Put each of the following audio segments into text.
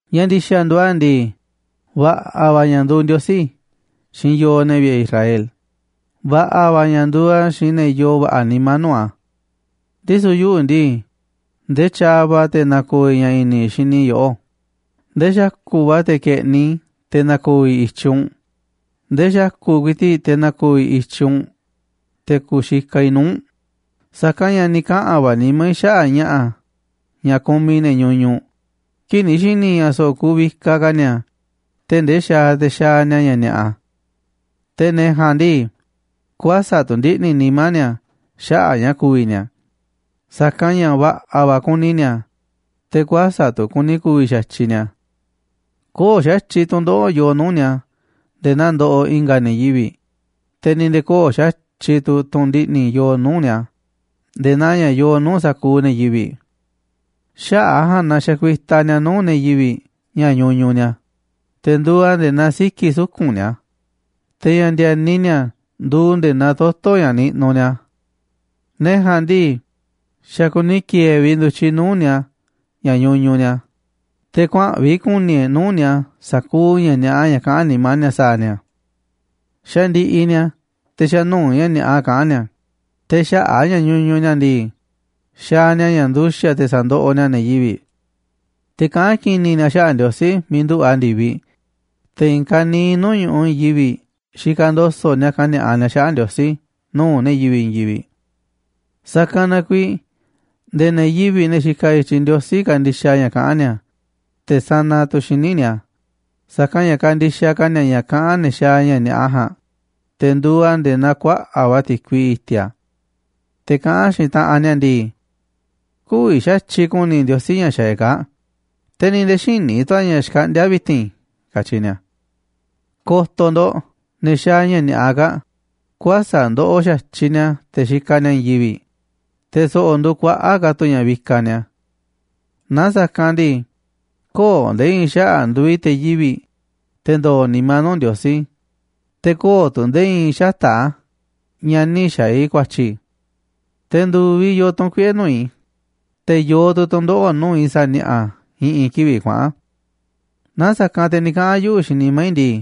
Ña̱ ndi̱xa̱ nduuꞌ a̱ ndii, va̱ꞌa̱ va̱ ña̱ nduuꞌ Ndiosí xiinꞌ yooꞌ, ne̱ vi̱ꞌe̱ Israel, va̱ꞌa̱ va̱ ña̱ nduuꞌ a̱ xiinꞌ ne̱ yoo va̱ꞌa̱ nimá nuu̱ꞌ a̱. Ndisu̱ yuꞌu̱ ndii, ndee tyaaꞌ va̱ te̱ na̱ko̱o̱ i̱ ña̱ i̱ni̱ xini i̱ yoꞌó, ndee xa̱ku̱ꞌ va̱ te̱ ke̱ꞌniꞌ i̱ te̱ na̱ko̱o̱ i̱ i̱tyiꞌ u̱nꞌ, ndee xa̱ku̱ꞌ ku̱i̱ti̱ꞌ te̱ na̱ko̱o̱ i̱ i̱tyiꞌ u̱nꞌ te̱ ku̱xikaꞌ i̱ nuu̱ꞌ u̱nꞌ. Sa̱kanꞌ ña̱ ni̱ kaꞌa̱n va̱ nimá i̱ xaꞌa̱ꞌ ña̱ꞌa̱ ña̱ kumiꞌ ne̱ ñuñuꞌ, kii̱ꞌ ni̱ xi̱ni̱ i̱ ña̱ so̱ꞌo̱ kuuꞌ vikaꞌ ka̱ ni̱a̱ tee̱ꞌ ndee xaaꞌ te̱ xaaꞌ ni̱a̱ ña̱ ni̱a̱ꞌa. Te̱ ne̱ ja̱a̱nꞌ ndii, kuäsa̱ꞌ tu̱ ndiꞌni̱ nimá ni̱a̱ xaꞌa̱ꞌ ña̱ ku̱vi̱ ni̱a̱, sa̱kanꞌ ña̱ va̱ꞌa̱ va̱ kuni ni̱a̱, te̱ kuäsa̱ꞌ tu̱ kuni ku̱vi̱ xa̱tyiꞌ ni̱a̱. Köo̱ꞌ xa̱tyiꞌ tu̱ndoꞌo̱ꞌ yoo nuu̱ꞌ ni̱a̱ nde̱e̱ naa ndoꞌoꞌ i̱nga̱ ne̱ yivi̱ꞌ, te̱ ni̱ nde̱e̱ köo̱ꞌ xa̱tyiꞌ tu̱ tu̱n ndiꞌni̱ yooꞌ nuu̱ꞌ ni̱a̱ nde̱e̱ naa ña̱ yoo nuu̱ꞌ sa̱kuuꞌ ne̱ yivi̱ꞌ. Xaꞌa̱ꞌ a̱ ja̱a̱nꞌ na xakuitaꞌ ni̱a̱ nuu̱ꞌ ne̱ yivi̱ꞌ ña̱ ñuñuꞌ ni̱a̱, te̱ nduuꞌ a̱ nde̱e̱ naa siki̱ suku̱nꞌ ni̱a̱, te̱ ña̱ ndi̱e̱ni ni̱a̱ nduuꞌ nde̱e̱ naa toto̱ ña̱ niꞌnuꞌ ni̱a̱. Ne̱ ja̱a̱nꞌ ndii, xa̱ kuni ki̱e̱e̱ vi̱ꞌ ndu̱tyiꞌ nuu̱ꞌ ni̱a̱ ña̱ ñuñuꞌ ni̱a̱, te̱ kuaa̱nꞌ vi̱ꞌ ku̱ni̱ e̱ꞌ nuu̱ꞌ ni̱a̱ sa̱kuuꞌ ña̱ ni̱a̱ꞌa ña̱ kaꞌán nimá ni̱a̱ sa̱a̱ ni̱a̱. Xandiꞌiꞌ ni̱a̱, te̱ xa̱ nuu̱ꞌ ña̱ ni̱a̱ꞌa kaꞌán ni̱a̱, te̱ xaꞌa̱ꞌ a̱ ña̱ ñuñuꞌ ni̱a̱ ndii, xaaꞌ ni̱a̱ ña̱ nduxa̱ꞌ te̱ sa̱ndoꞌoꞌ ni̱a̱ ne̱ yivi̱ꞌ. Te̱ kaꞌán ki̱ni̱ ni̱a̱ xaꞌa̱ꞌ Ndiosí miiꞌ nduꞌu̱ꞌ a̱ ndi̱viꞌ, te̱ i̱i̱n ka̱niiꞌ nuu̱ꞌ ñu̱ꞌuꞌ i̱i̱n yivi̱ꞌ xikaꞌ ndo̱so̱ꞌ ni̱a̱ kani̱a̱ꞌa ni̱a̱ xaꞌa̱ꞌ Ndiosí nuu̱ꞌ ne̱ yivi̱ꞌ i̱i̱n yivi̱ꞌ. Sa̱kanꞌ na kuiiꞌ nde̱e̱ ne̱ yivi̱ꞌ, ne̱ xikaꞌ i̱tyiꞌ Ndiosí, kandixaꞌ ña̱ kaꞌán ni̱a̱, te̱ sanaꞌ tu̱ xíniꞌ ni̱a̱, sa̱kanꞌ ña̱ kandixaꞌ ka̱ ni̱a̱ ña̱ kaꞌán ne̱ xaaꞌ ña̱ ni̱a̱ꞌa ja̱a̱nꞌ, te̱ nduuꞌ a̱ nde̱e̱ naa kuaꞌa̱ꞌ va̱ ti̱kui i̱ti̱a̱. Te̱ kaꞌán xiinꞌ taꞌanꞌ ni̱a̱ ndii: “Kü̱vi̱ xa̱tyiꞌ ku̱ni̱ Ndiosí ña̱ xaaꞌ e̱ꞌ kaa̱ꞌ, te̱ ni̱ nde̱e̱ xïní tu̱ a̱ ña̱ xkaꞌndíá vi̱ti̱n”, katyi ni̱a̱. Ko̱to̱ ndo̱ꞌ ne̱ xaaꞌ ña̱ ni̱a̱ꞌa kaa̱ꞌ, kuäsa̱ꞌ ndoꞌoꞌ xa̱tyiꞌ ni̱a̱ te̱ xikaꞌ ni̱a̱ i̱i̱n yivi̱ꞌ, te̱ so̱ꞌo̱ nduuꞌ kuaꞌa̱ꞌ ka̱ tu̱ ña̱ vikaꞌ ni̱a̱. Na sa̱kanꞌ ndii, köo̱ꞌ nde̱e̱ i̱i̱n xaꞌa̱ꞌ nduuꞌ i̱ te̱ yivi̱ꞌ, te̱ ndo̱o̱ nimá nuu̱ꞌ Ndiosí, te̱ köo̱ꞌ tu̱ nde̱e̱ i̱i̱n xata̱ꞌ a̱ ña̱ nï̱ xa̱a̱ i̱ ku̱a̱tyi̱. Te̱ ndu̱viꞌ yoo tu̱n kuiꞌe̱ nuu̱ꞌ i̱, te̱ yoo tu̱ tu̱ndoꞌo̱ꞌ nuu̱ꞌ i̱ sa̱a̱ ni̱a̱ꞌa̱ i̱ꞌi̱n kivi̱ꞌ kuaꞌa̱n. Naaꞌ sa̱kanꞌ te̱ ni̱ kaꞌa̱n yuꞌu̱ xiinꞌ nimá i̱ ndii: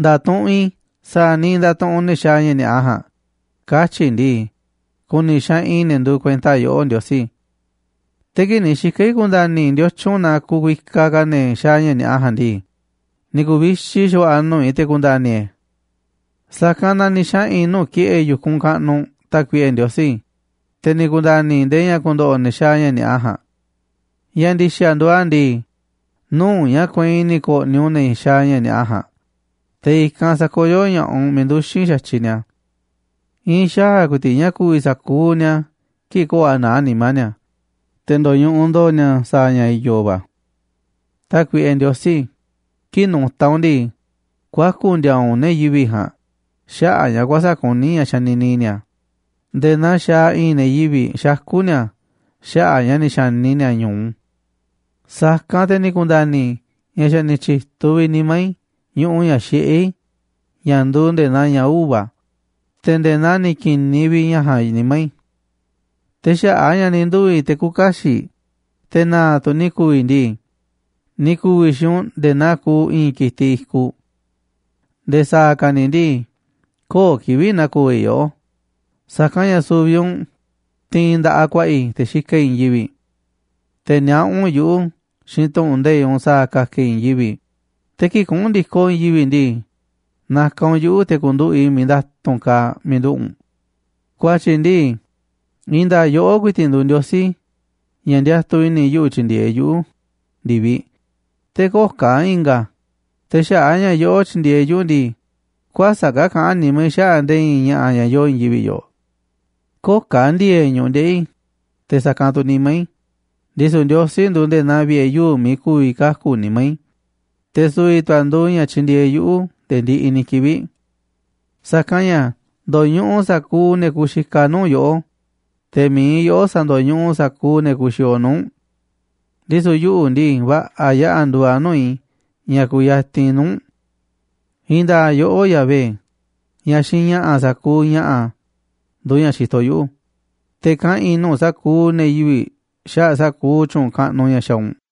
“Nda̱tuꞌunꞌ i̱ sa̱a̱ niiꞌ ndatuꞌunꞌ ne̱ xaaꞌ ña̱ ni̱a̱ꞌa ja̱a̱nꞌ”, katyi̱ i̱ ndii, ku̱ni̱ xaꞌanꞌ i̱ ne̱ nduuꞌ kuenta yoꞌó, Ndiosí. Te̱ kii̱ꞌ ni̱ xika̱ i̱ ku̱nda̱ni̱ i̱ ndiotyun na kuvikaꞌ ka̱ ne̱ xaaꞌ ña̱ ni̱a̱ꞌa ja̱a̱nꞌ ndii, ni̱ ku̱vixi xa̱va̱ꞌa̱ nuu̱ꞌ i̱ te̱ ku̱nda̱ni̱ e̱ꞌ e̱. Sa̱kanꞌ na ni̱ xaꞌa̱n i̱ nuu̱ꞌ ki̱ꞌe̱ yu̱kunꞌ kaꞌnuꞌ, Tákuiꞌe Ndiosí, te̱ ni̱ ku̱nda̱ni̱ i̱ ndee ña̱ ku̱ndo̱ꞌo̱ ne̱ xaaꞌ ña̱ ni̱a̱ꞌa ja̱a̱nꞌ. Ña̱ ndi̱xa̱ nduuꞌ a̱ ndii, nuu̱ꞌ ña̱ kueinꞌ ni̱ ko̱ꞌni̱ u̱nꞌ ne̱ xaaꞌ ña̱ ni̱a̱ꞌa ja̱a̱nꞌ, te̱ i̱kanꞌ sa̱koyó ña̱ꞌaꞌ u̱nꞌ miiꞌ nduxi̱n xa̱tyiꞌ ni̱a̱. I̱i̱n xaa̱ ku̱i̱ti̱ꞌ ña̱ ku̱vi̱ sa̱kuuꞌ ni̱a̱ kii̱ꞌ köo̱ꞌ a̱ naá nimá ni̱a̱, te̱ ndo̱ñuꞌuꞌ ndo̱o̱ ni̱a̱ sa̱a̱ ña̱ i̱yo̱ va̱. Tákuiꞌe Ndiosí, kii̱ꞌ nu̱ta̱ u̱nꞌ ndii, kuaku̱ ndi̱a̱a̱ u̱nꞌ ne̱ yivi̱ꞌ ja̱a̱nꞌ xaꞌa̱ꞌ ña̱ kuäsa̱ꞌ kuní ña̱ xanini ni̱a̱, nde̱e̱ naa xaaꞌ i̱i̱n ne̱ yivi̱ꞌ xakú ni̱a̱ xaꞌa̱ꞌ ña̱ ni̱ xa̱ni ni̱a̱ ñu̱u. Sa̱kanꞌ te̱ ni̱ ku̱nda̱ni̱ i̱ ña̱ xa̱ ni̱ tyi̱tuꞌ vi̱ꞌ nimá i̱ ñuꞌuꞌ ña̱ xiꞌé i̱ ña̱ nduuꞌ nde̱e̱ naa ña̱ uva̱, te̱ nde̱e̱ naa ni̱ ki̱niꞌ vi̱ꞌ ña̱ ja̱a̱nꞌ nimá i̱. Te̱ xaꞌa̱ꞌ a̱ ña̱ ni̱ nduu̱ i̱ te̱ küuꞌ kaxiꞌ, te̱ na̱a̱ tu̱ ni̱ ku̱u̱ i̱ ndii, ni̱ ku̱u̱ i̱ xiinꞌ u̱nꞌ nde̱e̱ naa kuuꞌ i̱i̱n ki̱tiꞌ i̱kuꞌ. Nde̱e̱ sa̱a̱ ka̱ ni̱ ndii, köo̱ꞌ kivi̱ꞌ na̱ko̱o̱ i̱ yoꞌó, sa̱kanꞌ ña̱ su̱vi̱ u̱nꞌ tiinꞌ nda̱ꞌaꞌ ku̱a̱ꞌa̱ i̱, te̱ xikaꞌ i̱ i̱i̱n yivi̱ꞌ. Te̱ niaꞌá u̱nꞌ yuꞌu̱ xiinꞌ tu̱ꞌu̱n nde̱iꞌ u̱nꞌ sa̱a̱ ka̱ka̱ i̱ i̱i̱n yivi̱ꞌ, te̱ kii̱ꞌ kuꞌu̱n ndi̱koꞌ i̱i̱n yivi̱ꞌ ndii, na̱ka̱ u̱nꞌ yuꞌu̱ te̱ ku̱nduꞌu̱ꞌ i̱ miiꞌ nda̱tu̱nꞌ kaaꞌ miiꞌ nduꞌu̱ꞌ u̱nꞌ. Ku̱a̱tyi̱ ndii, i̱i̱n nda̱a̱ꞌ yoꞌó ku̱i̱ti̱ꞌ nduuꞌ Ndiosí ña̱ ndiatuꞌ i̱ni̱ yuꞌu̱ tyi̱ndi̱e̱eꞌ yuꞌu̱ ndi̱viꞌ, te̱ köo̱ꞌ ka̱ i̱nga̱ a̱. Te̱ xaꞌa̱ꞌ a̱ ña̱ yoꞌó tyindieeꞌ yuꞌu̱ ndii, kuäsa̱ꞌ ka̱ kaꞌán nimá i̱ xaꞌa̱ꞌ nde̱e̱ i̱i̱n ña̱ꞌa̱ ña̱ yooꞌ i̱i̱n yivi̱ꞌ yoꞌoꞌ. Köo̱ꞌ ka̱ ndi̱e̱e̱ꞌ ñu̱ꞌuꞌ ndeꞌi̱ i̱, te̱ sa̱kanꞌ tu̱ nimá i̱, ndisu̱ Ndiosí nduuꞌ nde̱e̱ naa vi̱ꞌe̱ yuu̱ꞌ miiꞌ ku̱vi̱ kaku̱ nimá i̱, te̱ su̱vi̱ tu̱ a̱ nduuꞌ ña̱ tyindieeꞌ yuꞌu̱ nde̱e̱ ndiꞌiꞌ ni̱ kivi̱ꞌ. Sa̱kanꞌ ña̱ ndo̱ñuꞌuꞌ sa̱kuuꞌ ne̱ kuxikaꞌ nuu̱ꞌ yoꞌó, te̱ mi̱iꞌ yoꞌó sa̱ndo̱ñuꞌuꞌ sa̱kuuꞌ ne̱ kuxiooꞌ nuu̱ꞌ u̱nꞌ. Ndisu̱ yuꞌu̱ ndii, va̱ꞌa̱ yaꞌa̱ nduuꞌ a̱ nuu̱ꞌ i̱ ña̱ kuyatinꞌ i̱ nuu̱ꞌ u̱nꞌ. I̱i̱n nda̱a̱ꞌ yoꞌó, Yahvé, ña̱ xiinꞌ ña̱ꞌa̱ sa̱kuuꞌ ña̱ꞌa̱, nduuꞌ ña̱ xitoꞌ yuꞌu̱, te̱ kaꞌa̱n i̱ nuu̱ꞌ sa̱kuuꞌ ne̱ yivi̱ꞌ xaꞌa̱ꞌ sa̱kuuꞌ tyu̱u̱n kaꞌnuꞌ ña̱ xaaꞌ u̱nꞌ.